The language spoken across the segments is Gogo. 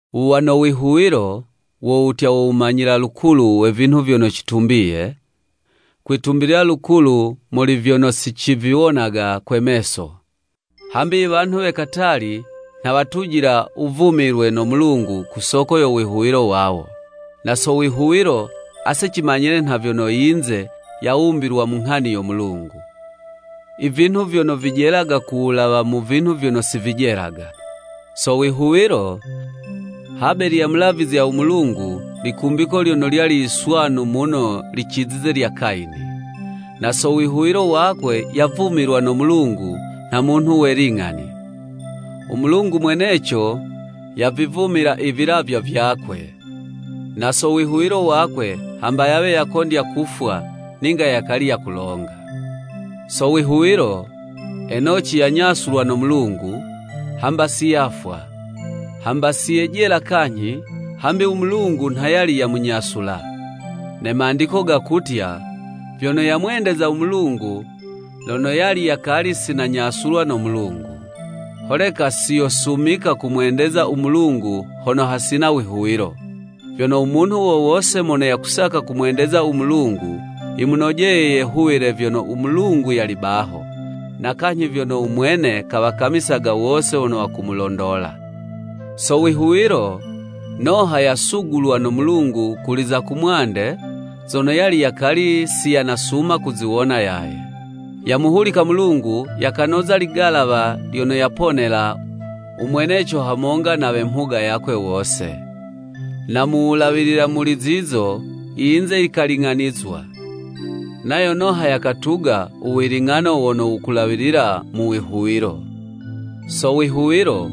Wuwa no wihuwilo, wo wutya wo wumanyile lukulu we vinhu vyono citumbiye, kwitumbilila lukulu muli vyono siciviwonaga kwe meso. Hambi i wanhu we katali, nha watujila u wuvumilwe no Mulungu ku soko yo wihuwilo wawo. Na so wihuwilo, ase cimanyile nha vyono yinze yawumbilwa mu Nghani yo Mulungu; i vinhu vyono vijelaga ku wulawa mu vinhu vyono si vijelaga. So wihuwilo, Habeli yamulavizya u Mulungu likumbiko lyono lyali yiswanu muno licizize lya Kayini. Na so wihuwilo wakwe yavumilwa no Mulungu nha munhu we ling'ani; u Mulungu mweneco yavivumila i vilavywa vyakwe. Na so wihuwilo wakwe, hamba yawe yakondya kufwa, ninga yakali yakulonga. So wihuwilo, Enoci yanyasulwa no Mulungu, hamba si yafwa. Hamba si yejela kanyhi, hambi u Mulungu nha yali yamunyasula. Ne Mandiko gakutya, vyono yamwendezaga u Mulungu lono yali yakali si nanyasulwa no Mulungu. Holeka si yosumika kumwendeza u Mulungu hono hasina wihuwilo. Vyono u munhu wo wose mono yakusaka kumwendeza u Mulungu, yimunojeye yehuwile vyono u Mulungu yali baho, na kanyhi vyono u Mwene kawakamisaga wose wono wakumulondola. So wihuwilo, Noha yasugulwa no Mulungu kuli za kumwande zono yali yakali si yanasuma kuziwona yaye. Yamuhuliko Mulungu, yakanoza ligalawa lyono yaponela u mweneco hamonga na we mhuga yakwe wose. Na mu wulawilila muli zizo, i yinze yikaling'anizwa, nayo Noha yakatuga u wiling'ano wono wukulawilila mu wihuwilo. So wihuwilo,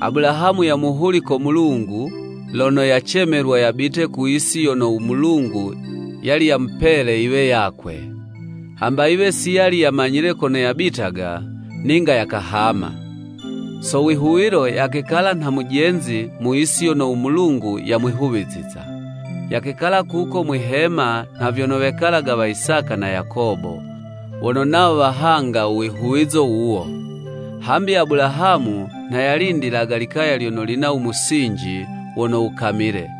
Abulahamu yamuhuliko Mulungu lono yacemelwa yabite ku yisi yono u Mulungu yali yamupele yiwe yakwe. Hamba yiwe si yali yamanyile kono yabitaga, ninga yakahama. So wihuwilo, yakekala nha mujenzi mu yisi yono u Mulungu yamwihuwiziza. Yakekala kuko mwihema nha vyono wekalaga wa Isaka na Yakobo, wono nawo wahanga u wihuwizo wuwo. Hambi Abulahamu nha yalindilaga likaya lyono lina u musinji wono wukamile,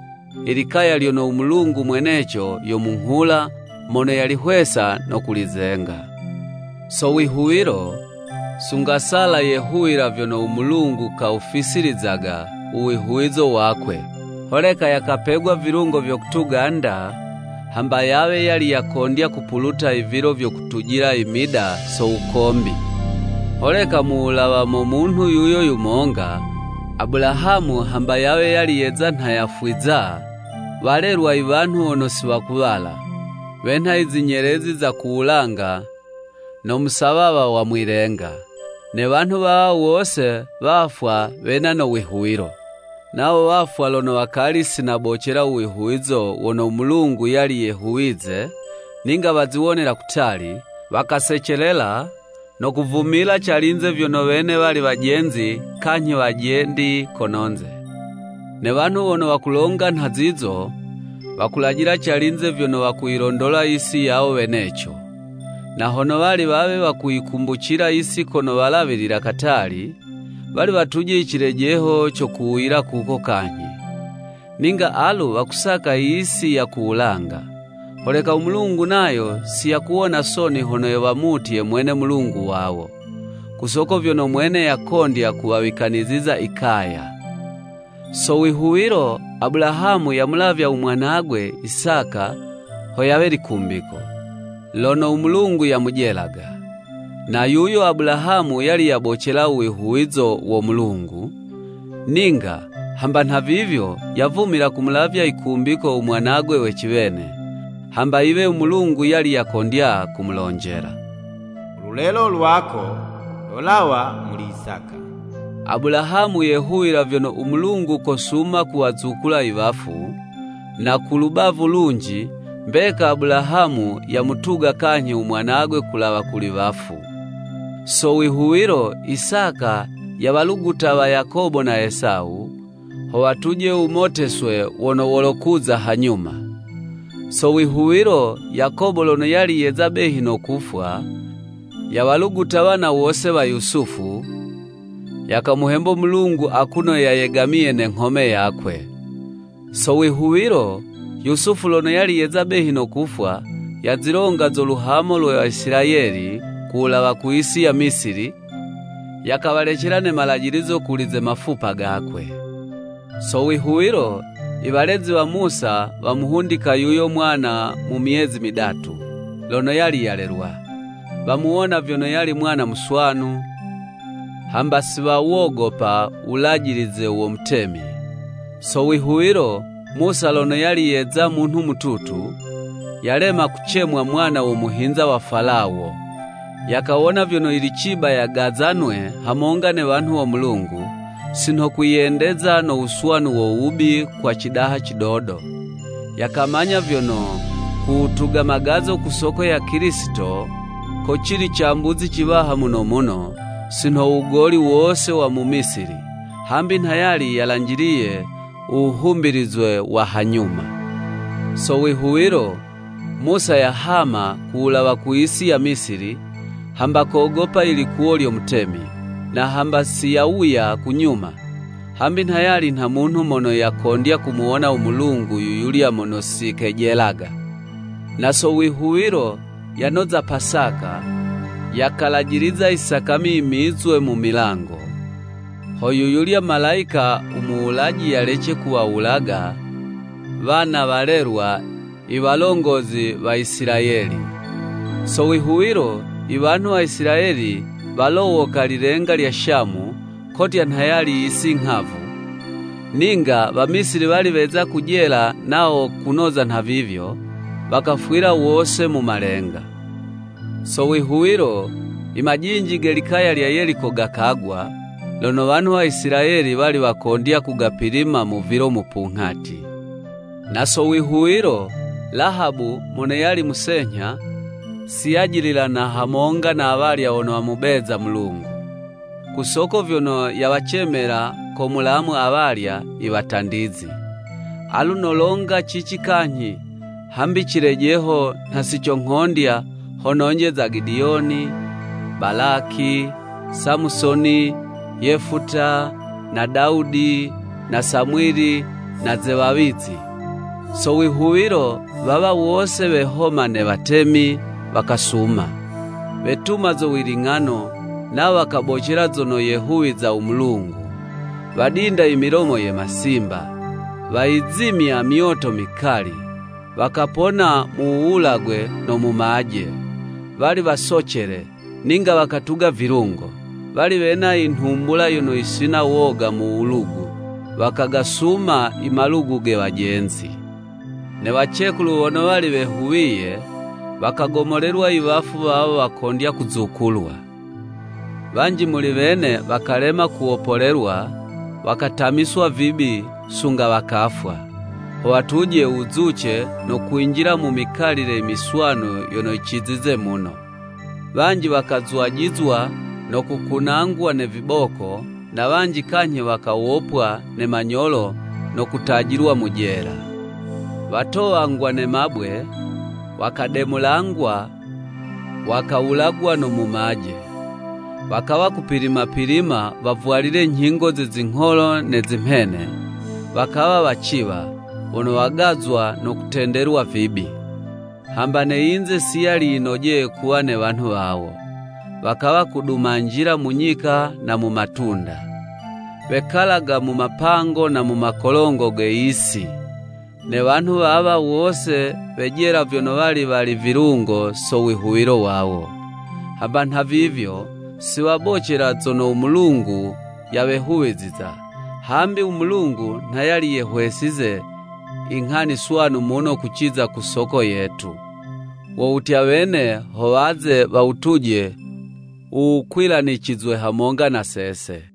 i likaya lyono u Mulungu mweneco yo munghula mono yalihwesa no kulizenga. So wihuwilo, sunga Sala yehuwila vyono u Mulungu kawufisilizaga u wihuwizo wakwe, holeka yakapegwa vilungo vyo kutuga 'nda, hamba yawe yali yakondya kupuluta i vilo vyo kutujila i mida so wukombi. Holeka mu wulawa mo munhu yuyo yumonga, Abulahamu hamba yawe yali yeza nha yafwiza, walelwa i wanhu wono si wakuwala, wenha i zinyelezi za ku wulanga no musawawa wa mwi'lenga. Ne wanhu wawa wose wafwa wena no wihuwilo. Nawo wafwa lono wakali si nabocela u wihuwilo wono u Mulungu yali yehuwize, ninga waziwonela kutali, wakasecelela, no kuvumila calinze vyono wene wali wajenzi kanyhi wajendi kono'nze. Ne wanhu wono wakulonga nha zizo, wakulajila calinze vyono wakuyilondola yisi yawo weneco. Na hono wali wawe wakuyikumbucila yisi kono walawilila katali, wali watuje i cilejeho co kuwuyila kuko kanyhi. Ninga alu wakusaka i yisi ya ku wulanga. Holeka u Mulungu nayo si yakuwona soni hono wamutye Mwene Mulungu wawo, ku soko vyono Mwene yakondya kuwawikaniziza i kaya. So wihuwilo, Abulahamu yamulavya u mwanagwe Isaka ho yawe likumbiko, lono u Mulungu yamujelaga. Na yuyo Abulahamu yali yabocela u wihuwizo wo Mulungu, ninga, hamba nhavivyo, yavumila kumulavya yikumbiko u mwanagwe we ciwene, hamba yiwe u Mulungu yali yakondya kumulonjela. “U lulelo lwako lolawa muli Isaka.” Abulahamu yehuwila vyono u Mulungu kosuma kuwazukula i wafu: na ku lubavu lunji, mbeka Abulahamu yamutuga kanyhi u mwanagwe kulawa kuli wafu. So wihuwilo, Isaka yawaluguta wa Yakobo na Esawu, ho watuje u wumoteswe wono wolokuza hanyuma. So wihuwilo, Yakobo lono yali yeza behi no kufwa, yawaluguta wana wose wa Yusufu, yakamuhembo Mulungu akuno yayegamiye ne nghome yakwe. So wihuwilo, Yusufu lono yali yeza behi no kufwa, yazilonga zo luhamo lwe Waisilayeli ku wulawa ku yisi ya Misili, yakawalecela ne malajilizo kuli ze mafupa gakwe. Sowihuwilo, i walezi wa Musa wamuhundika yuyo mwana mu myezi midatu, lono yali yalelwa. Wamuwona vyono yali mwana muswanu, hamba si wawogopa u wulajilize wo mutemi. So wihuwilo, Musa lono yali yeza munhu mututu, yalema kucemwa mwana wo muhinza wa Falawo. Yakawona vyono yili ciba yagazanwe hamonga ne wanhu wo Mulungu, si nho kwiyendeza no wuswanu wo wubi kwa cidaha cidodo. Yakamanya vyono, ku wutuga magazo ku soko ya Kilisito, ko cili cambuzi ciwaha muno muno, si nho u wugoli wose wa mu Misili, hambi nha yali yalanjiliye u wuhumbilizwe wa hanyuma. So wihuwilo, Musa yahama ku wulawa ku yisi ya Misili, hamba kogopa i likuwo lyo mutemi, na hamba si yawuya ku nyuma, hambi nha yali nha munhu mono yakondya kumuwona u Mulungu yu yulya mono si kejelaga. Na so wihuwilo, yanoza Pasaka, yakalajiliza i sakami yimizwe mu milango, ho yu yulya malayika u muwulaji yalece kuwawulaga wana walelwa i walongozi wa Isilayeli. So wihuwilo, i wanhu wa Isilayeli walowoka lilenga lya Shamu, kotya nha yali yisi nghavu; ninga Wamisili wali weza kujela nawo kunoza nhavivyo, wakafwila wose mu malenga. So wihuwilo, i majinji ge likaya lya Yeliko gakagwa, lono wanhu wa Isilayeli wali wakondya kugapilima mu vilo mupunghati. Na so wihuwilo, Lahabu mono yali musenyha, si yajililana hamonga na awalya wono wamubeza Mulungu, ku soko vyono yawacemela ko mulamu awalya i watandizi. Alu nolonga cici kanyhi, hambi cilejeho nha si conghondya ho nonje za Gidiyoni, Balaki, Samusoni, Yefuta, na Dawudi, na Samwili na ze wawizi. So wihuwilo, wawa wose wehoma ne watemi, wakasuma. Wetuma zo wiling'ano, nawo wakabocela zono yehuwiza u Mulungu. Wadinda i milomo ye masimba, wayizimya myoto mikali, wakapona mu wuwulagwe no mumaje. Wali wasocele, ninga wakatuga vilungo. Wali wena inhumbula yono yisina woga mu wulugu, wakagasuma i malugu ge wajenzi. Ne wacekulu wono wali wehuwiye, wakagomolelwa i wafu wawo wakondya kuzukulwa. Wanji muli wene wakalema kuwopolelwa, wakatamiswa vibi sunga wakafwa, ho watuje u wuzuce no kwinjila mu mikalile imiswanu yono yicizize muno. Wanji wakazwajizwa no kukunangwa ne viboko, na wanji kanyhi wakawopwa ne manyolo no kutajilwa mu jela. Watowangwa ne mabwe, wakademulangwa, wakawulagwa no mumaje. Wakawa kupilima-pilima wavwalile nyhingo ze zingholo ne zimhene, wakawa waciwa, wono wagazwa no kutendelwa vibi. Hamba ne yinze si yali yinojeye kuwa ne wanhu wawo. Wakawa kudumanjila mu nyika na mu matunda; wekalaga mu mapango na mu makolongo ge yisi. Ne wanhu wawa wose wejela vyono wali wali vilungo so wihuwilo wawo. Hamba nha vivyo, si wabocela zono u Mulungu yawehuwiziza, hambi u Mulungu nha yali yehwesize i nghani swanu muno kuciza ku soko yetu; wo wutya wene ho waze wawutuje u wukwilanicizwe hamonga na sese.